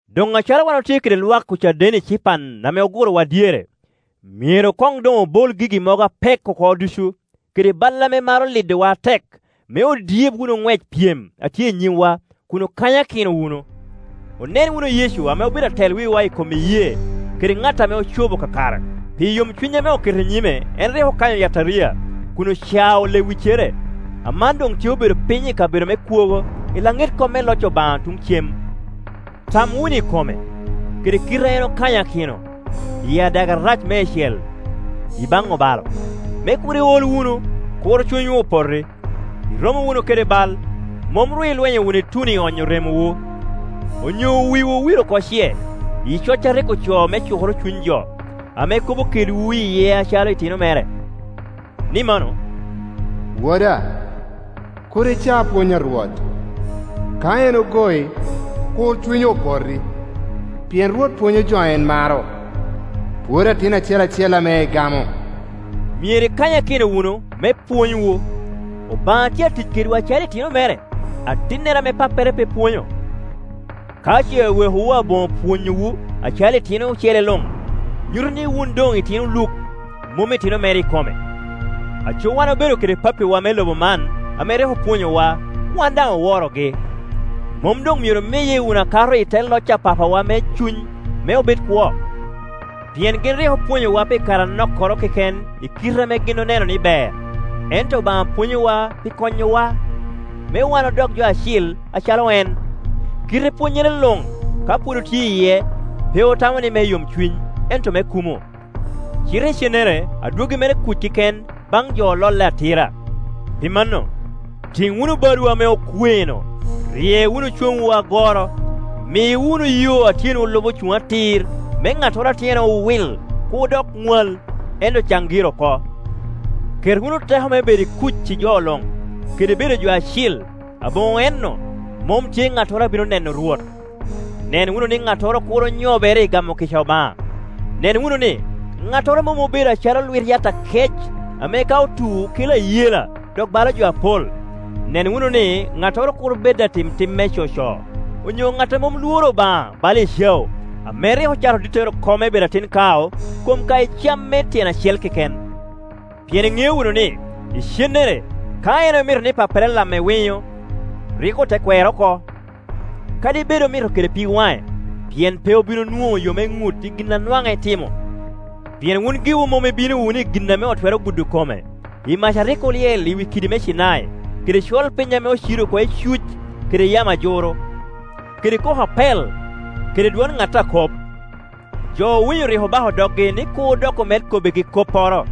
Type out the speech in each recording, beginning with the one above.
Doŋ acalo wan otye kede lwak ocaden ecipan ame ogurowa dyere, myero doŋ doŋ obol gigi mogo apek oko ducu, kede bal ame maro lidowa atek, me odyeb wunu ŋwec pyem a tye i nyimwa, kun okanyakino wunu. Onen wunu Yecu ame obedo atel wiwa i kom iyee kede ŋat ame ocobo kakare. Pi yomcuny ame oketo i nyime en rik okanyo yataria, kun ocao lewiccere; aman doŋ tye obedo piny i kabedo me kwogo i laŋet kom me loc Obaŋa tuŋ cem. Tam wunu i kome, kede kite a en okanyokino i adage arac meicel i baŋ obalo, me kur iol wunu, kur cunywu opoti. I romowu kede bal, mom ru ilwenyo wunu ituno i onyo remowu. Onyo wiwu owil oko ce i coc a rik ocoo me cukoro cuny jo, ame kobo kedwu iye acalo itino mere? Ni mano, “Woda, kur ica pwony a Rwot; ka en ogoi, kur cunyi opoti. Pien Rwot pwonyo jo a en maro, pwodo atin acel acel ame egamo.” Myero ikanyakino wunu, me pwonywu. Obaŋa tye a tic kedwu acalo itino mere; atinnene ame pappere pe pwonyo? Ka ce owekowu aboŋo pwonyowu acalo itino ocele luŋ, nyuto ni wun doŋ itino luk, mom itino mere ikome. Aco wan obedo kede pappiwa me lobo man ame rik opwonyowa, wan daŋ oworogi. Mom doŋ myero omiye wunu akato i te loc a Papa wa me cuny me obed kwo? Pien gin rik opwonyowa pi kare anokkoro keken i kite ame gin oneno ni ber, ento Obaŋa pwonyowa pi konyowa, me wan odok jo acil acalo en. Kite pwonyere luŋ, ka pwod otye iye, pe otamo ni me yomcuny ento me kumo, cite icennere adwoggi mere kuc keken baŋ jo ololle atira. Pi mano, tiŋ wunu badwu ame okwe-nu, rye wunu coŋwu agoro, mi wunu yo a tyenwu lubo cuŋ atir, me ŋattoro a tyene owil kur dok ŋwal, ento can gire oko. Ket wunu teko me bedo i kuc i jo luŋ, kede bedo jo acil; aboŋo en-nu, mom tye ŋattoro a bino neno Rwot. Nen wunu ni ŋattoro kur onyobere i gamo kica Obaŋa. Nen wununi, ŋattoro mom obedo acalo lwit yat akec ame ka otu kela ayela, dok balo jo apol. Nen wunu ni ŋattoro kur bed atim tim me coco, onyo ŋat a mom lworo Obaŋa bala Ecau, ame rik ocato dittere oko me bedo atin kao kom ka i cam me tyen acel keken. Pien iŋeo wunu ni, icennere, ka en omito ni pappere lamme winyo, rik ote kwere oko, kadi bed omito kede pig waŋe, pien pe obin onwoŋo yo me ŋut i gin a nwaŋ etimo. Pien wun giwu mom ibino wunu i gin ame otwero gudo kome, i mac a rik olyel i wi kidi me Cinai, kede colpiny ame ocido oko icuc, kede yamo ajuru, kede koko apel kede dwon ŋat a kop. Jo owinyo rik obako doggi ni kur dok omed kobbigi kopporo,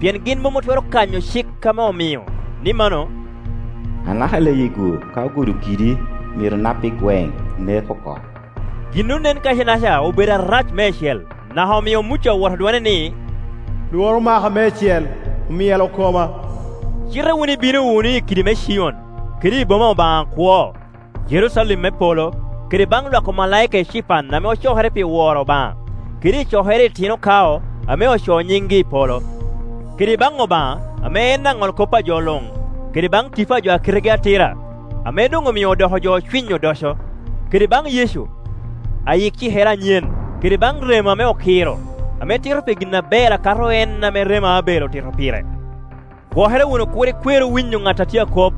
pien gin mom otwero kanyo cik ame omio, ni mano, “Anaka leyi-gu, ka ogudo kidi, myero nap i gweŋ, neko oko,” Gin onen kaci-naca obedo arac meicel, naka omio Muca owoto dwone ni, “Lworo omaka meicel, omyelo koma.” Cite wun ibino wunu i kidi me Cion, kede i boma Obaŋa akwo, Jerucalem me polo, kede baŋ lwak omalaika ecipan ame ocokere pi woro Obaŋa, kede i cokere itino kao ame ocoo nyingi i polo, kede baŋ Obaŋa, ame en aŋolkop a jo luŋ, kede baŋ tipo jo a kitegi atira, ame doŋ omio doko jo ocwiny odoco, kede baŋ Yecu, ayik cikere anyen, kede baŋ remo ame okiro, ame tito pi gin aber a kato en ame remo Abel otito pire. Gwokere wunu kur ikweru winyo ŋat a tye akop.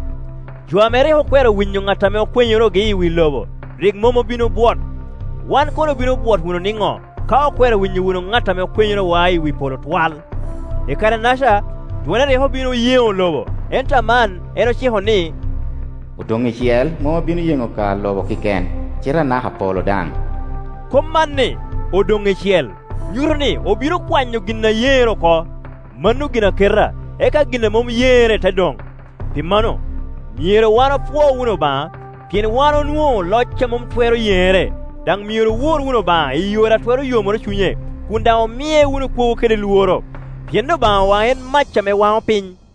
Jo ame rik okwero winyo ŋat ame okwenyorogi i wi lobo rik mom obin obwot. Wan kono obino bwot wunu niŋo, ka okwero winyo wunu ŋat ame akwenyorowa i wi polo twal? I kare-naca, dwone rik obin oyeŋo lobo; ento aman en ociko ni, “Odoŋ icel, mom abino yeŋo ka lobo keken, cite anaka polo daŋ.” Kop man ni, “Odoŋ icel,” nyuto ni, obino kwanyo gin a yeŋere oko, mano ginaketa, eka gin a mom yeŋere te doŋ. Pi mano, myero wan opwo wunu Obaŋa, pien wan onwoŋo loc a mom twero yeŋere, daŋ myero owor wunu Obaŋa i yore a twero yomoro cunye, kun daŋ omie wunu kwogo kede lworo, pien Obaŋawa en mac ame wano piny.